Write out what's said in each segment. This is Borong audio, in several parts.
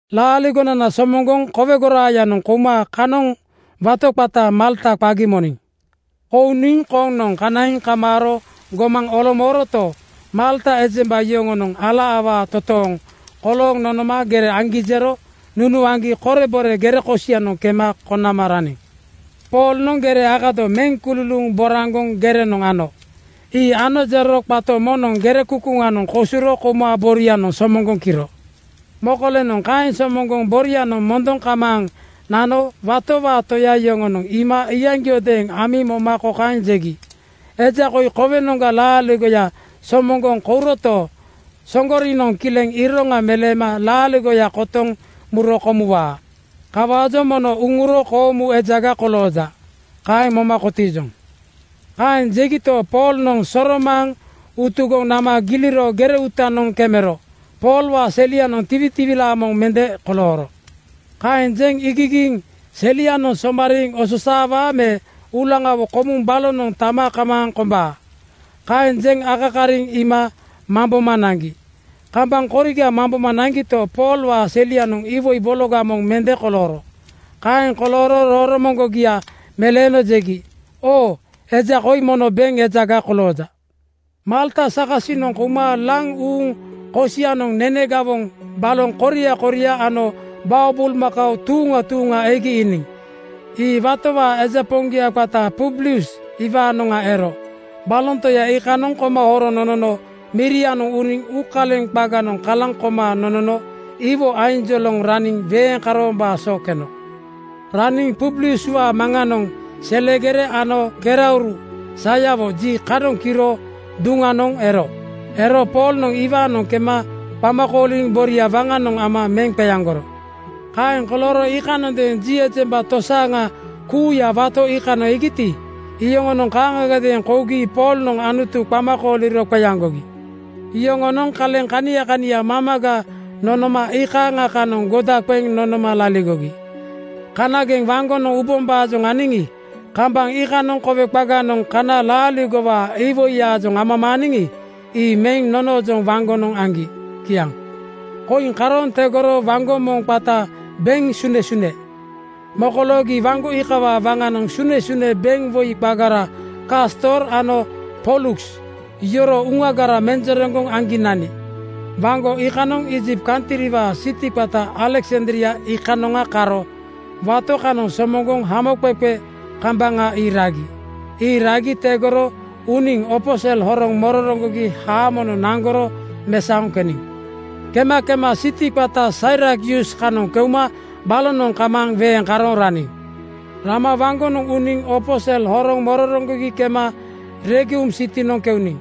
Laaligonana somoŋgoŋ kowe goraayanoŋ kouma kanoŋ wato qata Malta qagi moniŋ. Kouniŋ koŋnoŋ kanaiŋ kamaaro gomaŋ olomooroto, Malta ejemba yoŋonoŋ ala awaa toontooŋ kolooŋ nonoma gere aŋgi jero nunuaŋgi korebore gere kosianoŋ kema konama raniŋ. Poolnoŋ gere akado meŋ kululuuŋ boraŋgoŋ gerenoŋ ano. Ii ano jero qato moŋnoŋ gere kukuŋanoŋ kosuro kouma borianoŋ somoŋgoŋ kiro. Mokolenoŋ kaeŋ somoŋgoŋ borianoŋ mondoŋ kamaaŋ nano watowaa toya yoŋonoŋ iima iyaŋgiodeeŋ amiŋ moma kokaeŋ jegi, “Eja koi kowenoŋga laaligoya somoŋgoŋ kouroto, Soŋgorinoŋ kileŋ iroŋa meleema laaligoya kotoŋ muro komuwaa. Kawaajoŋ mono uŋuro koomu ejaga kolooja. Kaeŋ moma kotiijoŋ.” Kaeŋ jegito, Poolnoŋ soromaaŋ utugoŋ nama giliro gere uutanoŋ kemero Poolwaa selianoŋ tiwitiwilaa moŋ mende kolooro. Kaeŋ jeŋ iigigiiŋ “Selia somariiŋ osaawaa me uulaŋawo komuŋ balonoŋ tama kamaaŋ kombaa,” kaeŋ jeŋ akakariŋ iima mamboma naŋgi. Kambaŋ koriga mamboma naŋgito, Poolwaa selianoŋ iwoi bologa moŋ mende kolooro. Kaeŋ kolooro roromoŋgia meleeno jegi, “Oo, eja koi mono beŋ ejaga kolooja.” Malta sakasinoŋ kouma laŋ uuŋ kosianoŋ nene gawoŋ baloŋ koria koria ano bao bulmakao tuuŋa tuuŋa egi iiniŋ. Ii watowaa eja poŋgia qata Publius iwaanoŋa ero. Baloŋ toya iikanoŋ koma horoŋ nonono mirianoŋ uniŋ uukaleŋ qaganoŋ kalaŋ koma nonono iwo ainjoloŋ raniŋ weeŋ karoombaa so keno. Raniŋ Publiuswaa maŋanoŋ selegere ano kerauru sayawo ji (dysentery) kanoŋ kiro duŋnondeeŋ ero. Ero Poolnoŋ iwaanoŋ kema qama kooliŋ boria waŋanoŋ ama meŋ qeaŋgoro. Kaeŋ kolooro iikanondeeŋ ji ejemba tosaaŋa kuuya wato iikanoŋ egiti, iyoŋonoŋ kaaŋagadeeŋ kougi Poolnoŋ Anutu qama kooliro qeaŋgogi. Yoŋonoŋ kaleŋ kania kania mamaga nonoma iikaaŋa kanoŋ goda qeŋ nonoma laligogi. Kanageŋ waŋgonoŋ ubombaajoŋ aniŋi, kambaŋ iikanoŋ kowe qaganoŋ kana laaligowaa iwoiyaajoŋ amamaaniŋi, ii meŋ nonoojoŋ waŋgonoŋ aŋgi. Kiaŋ. Koiŋ karooŋ tegoro waŋgo moŋ qata “Beŋ Sunesune” mokoloogi. Waŋgo iikawaa waŋanoŋ sunesune beŋwoi qagara Kastor ano Poluks yoroo uŋagara menjereŋgoŋ aŋgi nani. Waŋgo kanoŋ Iijipt kantriwaa siti qata Aleksandria iikanoŋa karo wato kanoŋ somoŋgoŋ haamoqeqe kambaŋa ii ragi. Ii ragi tegoro uniŋ opo sel horoŋ mororoŋgogi haamonoŋ naŋgoro mesaoŋ keniŋ. Kema kema siti qata Sairakyus kanoŋ keuma balonoŋ kamaaŋ weeŋ karooŋ raniŋ. Rama waŋgonoŋ uniŋ opo sel horoŋ mororoŋgogi kema Regium sitinoŋ keuniŋ.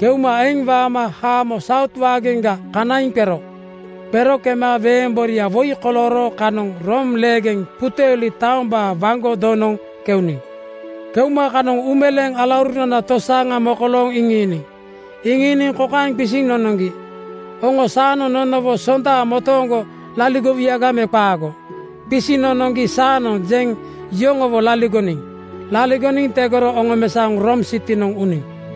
Keuma eŋ waama haamo Saut waageŋga kanaiŋ qero. Qero kema weeŋ boria woi kolooro kanoŋ Room leegeŋ Puteoli taombaa waŋgo donoŋ keuniŋ. Keuma kanoŋ uumeleeŋ alaurunana tosaaŋa mokolooŋ iŋiiniŋ. Iŋiiniŋ kokaeŋ qisiŋ nonoŋgi, “Oŋo saanoŋ nonowo sonda motooŋgo laligowuyaga me qaago?” Qisiŋ nonoŋgi “Saanoŋ,” jeŋ yoŋowo laligoniŋ. Laligoniŋ tegoro oŋomesaoŋ Room sitinoŋ uniŋ.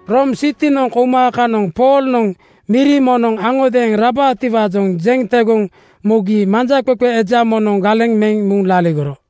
Room sitinoŋ kouma kanoŋ Poolnoŋ miri moŋnoŋ aŋodeeŋ rabaatiwaajoŋ jeŋ tegoŋ mugi manjaqeqe eja moŋnoŋ galeŋ meŋ muŋ laligoro.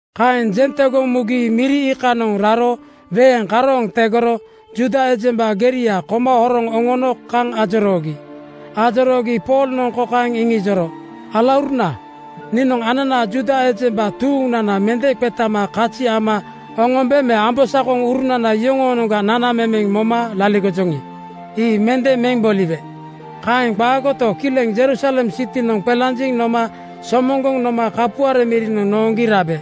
Kaeŋ jeŋ tegoŋ mugi miri iikanoŋ raro weeŋ karooŋ tegoro Juuda ejemba geria koma horoŋ oŋono kaŋ ajoroogi. Ajoroogi Poolnoŋ kokaeŋ iŋijoro, “Alauruna, niinoŋ ananaa Juuda ejemba tuuŋnana mende qetama kazi ama oŋombe me ambosakoŋurunana yoŋoonoŋga nanamemeŋ moma laligojoŋi, ii mende meŋ boliwe. Kaeŋ qaagoto, kileŋ Jerusalem sitinoŋ qelanjiŋ noma somoŋgoŋ noma kapuare mirinoŋ nooŋgi rabe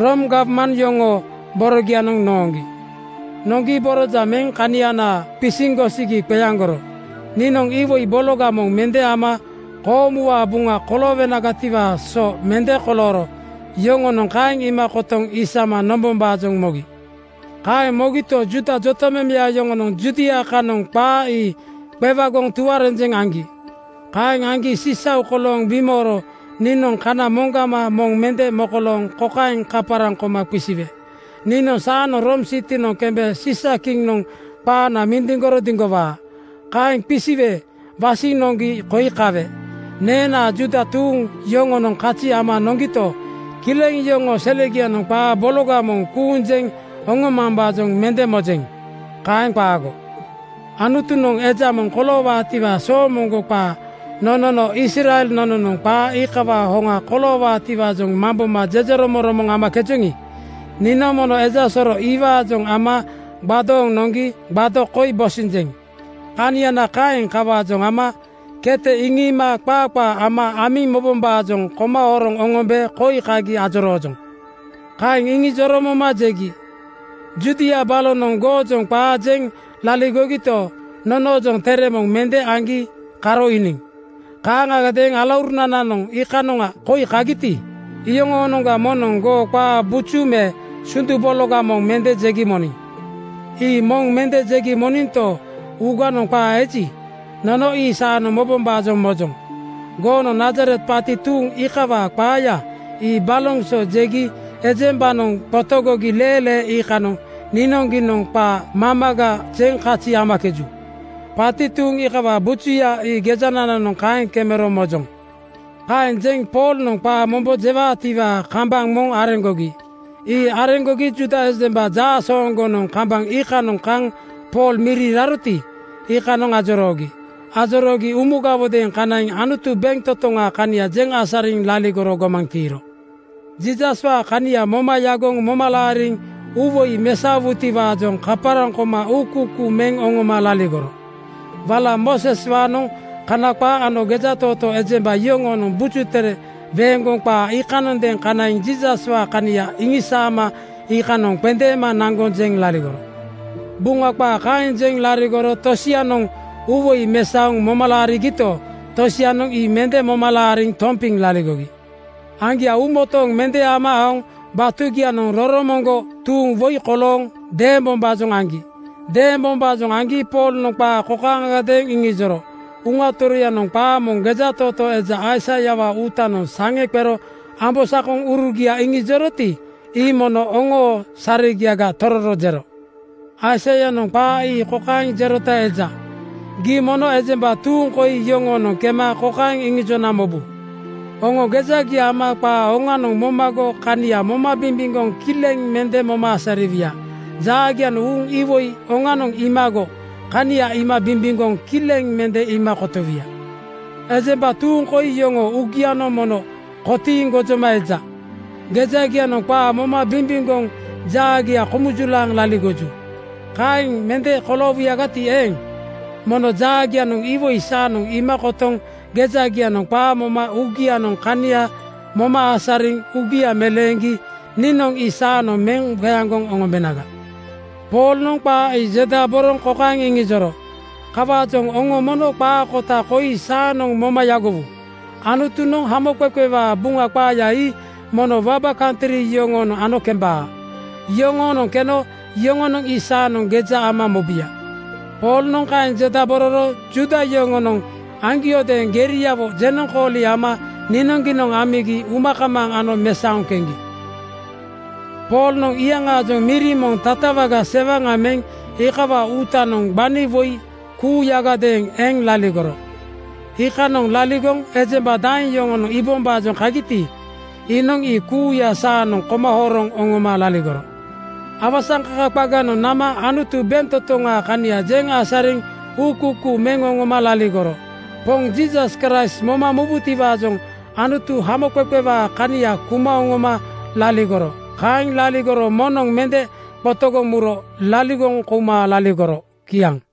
Room gawman yoŋoo borogianoŋ nooŋgi. Nooŋgi borojaŋ meŋ kanianaa qisiŋ gosigi qeaŋgoro. Niinoŋ iwoi bologa moŋ mende ama koomuwaa buŋa koloowenagatiwaa so mende kolooro. Yoŋonoŋ kaeŋ iima kotoŋ isama nombombaajoŋ mogi. “Kaeŋ mogito, Juuda jotamemeya yoŋonoŋ Judia kanoŋ qaa ii qewagoŋ tuarenjeŋ aŋgi. Kaeŋ aŋgi sisau kolooŋ bimooro niinoŋ kana moŋgama moŋ mende mokolooŋ kokaeŋ kaparaŋ koma qisiwe, ‘Niinoŋ saanoŋ Room sitinoŋ kembe Siisakiŋnoŋ qaana mindiŋgoro diŋgowaa.’ Kaeŋ qisiwe wasiŋ noŋgi koi kawe. Neenaa Juuda tuuŋ yoŋonoŋ kazi ama noŋgito, kileŋ yoŋoo selegianoŋ qaa bologa moŋ kuuŋ jeŋ oŋomambaajoŋ mende mojeŋ. Kaeŋ qaago. Anutunoŋ eja moŋ koloowaatiwaa soomoŋgo qaa nonono Israel nononoŋ qaa iikawaa hoŋa koloowaatiwaajoŋ mamboma jejeromoŋromoŋ amakejoŋi, niinoŋ mono eja soro iwaajoŋ ama gbadooŋ noŋgi gbado (tape) koi bosinjeŋ. Kaniana kaeŋ. Kawaajoŋ ama kete iŋiima qaa qaa ama amiŋ mobombaajoŋ koma horoŋ oŋombe koi kagi ajoroojoŋ.” Kaeŋ iŋijoro moma jegi, “Judia balonoŋ goojoŋ qaa jeŋ laligogito, nonoojoŋ tere moŋ mende aŋgi karo iiniŋ. Kaaŋagadeeŋ alaurunananoŋ iikanoŋa koi kagiti, iyoŋoonoŋga moŋnoŋ goo qaa buju me sundu bologa moŋ mende jegi moniŋ. Ii moŋ mende jegi moninto, uuganoŋ qaa eji, nono ii saanoŋ mobombaajoŋ mojoŋ. Goonoŋ Nazaret paati tuuŋ iikawaa qaaya ii baloŋ so jegi ejembanoŋ qotogogi leelee iikanoŋ niinoŋgiinoŋ qaa mamaga jeŋ kazi amakeju. Paati tuuŋ iikawaa bujuya ii gejanananoŋ kaeŋ kemero mojoŋ.” Kaeŋ jeŋ Poolnoŋ qaa mombo jewaatiwaa kambaŋ moŋ areŋgogi. Ii areŋgogi Juuda ejemba jaasooŋgonoŋ kambaŋ iikanoŋ kaŋ Pool miri raroti, iikanoŋ ajoroogi. Ajoroogi umugawodeeŋ kanaiŋ Anutu bentotoŋaa kania jeŋ asariŋ laligoro gomaŋ tiiro. Jiisaswaa kania moma yagoŋ moma laariŋ uuwoi mesaowutiwaajoŋ kaparaŋ koma uukuukuu meŋ oŋoma laligoro. Wala Mooseswaanoŋ Kana qaa ano gejatootoo ejemba yoŋoonoŋ Buju Tere weeŋgoŋ qaa iikanoŋadeeŋ kanaiŋ Jiisaswaa kania iŋisaama iikanoŋ qendeema naŋgoŋ jeŋ laligoro. Buŋa qaa kaeŋ jeŋ laligoro tosianoŋ uuwoi mesaoŋ moma laarigito, tosianoŋ ii mende moma laariŋ tompiŋ laligogi. Aŋgia uumotooŋ mende ama aoŋ batugianoŋ roromoŋgo tuuŋ woi kolooŋ deembombaajoŋ aŋgi. Deembombaajoŋ aŋgi Poolnoŋ qaa kokaaŋagadeeŋ iŋijoro, “Uŋa Toroyanoŋ qaa moŋ gejatootoo eja Aisaiawaa uutanoŋ saŋe qero ambosakoŋurugia iŋijoroti, ii mono oŋoo saregiaga tororo jero. Aisaianoŋ qaa ii kokaeŋ jerota eja, ‘Gii mono ejemba tuuŋ koi yoŋoonoŋ kema kokaeŋ iŋijona mobu: Oŋo gejagia ama qaa oŋanoŋ momago kania moma bimbimgoŋ kileŋ mende moma asariwuya. Jaagianoŋ uuŋ iwoi oŋanoŋ iimago kania iima bimbimgoŋ kileŋ mende iima kotowuya. Ejemba tuuŋ koi yoŋoo uugianoŋ mono kotiiŋ gojoma eja. Gejagianoŋ qaa moma bimbimgoŋ jaagia komujulaaŋ laligoju. Kaeŋ mende koloowuyagati eeŋ, mono jaagianoŋ iwoi saanoŋ iima kotoŋ gejagianoŋ qaa moma uugianoŋ kania moma asariŋ uugia meleeŋgi niinoŋ ii saanoŋ meŋ qeaŋgoŋ oŋombenaga.’” Poolnoŋ qaa ii jendaboroŋ kokaeŋ iŋijoro, “Kawaajoŋ oŋo mono qaa kota koi saanoŋ moma yagowu: Anutunoŋ hamoqeqewaa Buŋa qaaya ii mono waba kantri yoŋoonoŋ ano kembaa. Yoŋoonoŋ keno yoŋonoŋ ii saanoŋ geja ama mobuya.” (Poolnoŋ kaeŋ jendabororo Juuda yoŋonoŋ aŋgiodeeŋ geriawo jenoŋkooli ama niinoŋgiinoŋ amigi uma kamaaŋ ano mesaoŋ keŋgi.) Poolnoŋ iyaŋaajoŋ miri moŋ tatawaga sewaŋa meŋ iikawaa uutanoŋ gbani woi kuuyagadeeŋ eŋ laligoro. Iikanoŋ laligoŋ ejemba daeŋ yoŋonoŋ iibombaajoŋ kagiti, iinoŋ ii kuuya saanoŋ koma horoŋ oŋoma laligoro. Awasaŋkaka qaganoŋ nama Anutu bentotoŋaa kania jeŋ asariŋ uukuukuu meŋ oŋoma laligoro. Poŋ Jiisas Kraist moma mubutiwaajoŋ Anutu hamoqeqewaa kania kuma oŋoma laligoro. Kaeŋ laligoro moŋnoŋ mende qotogoŋ muro laligoŋ kouma laligoro. Kiaŋ.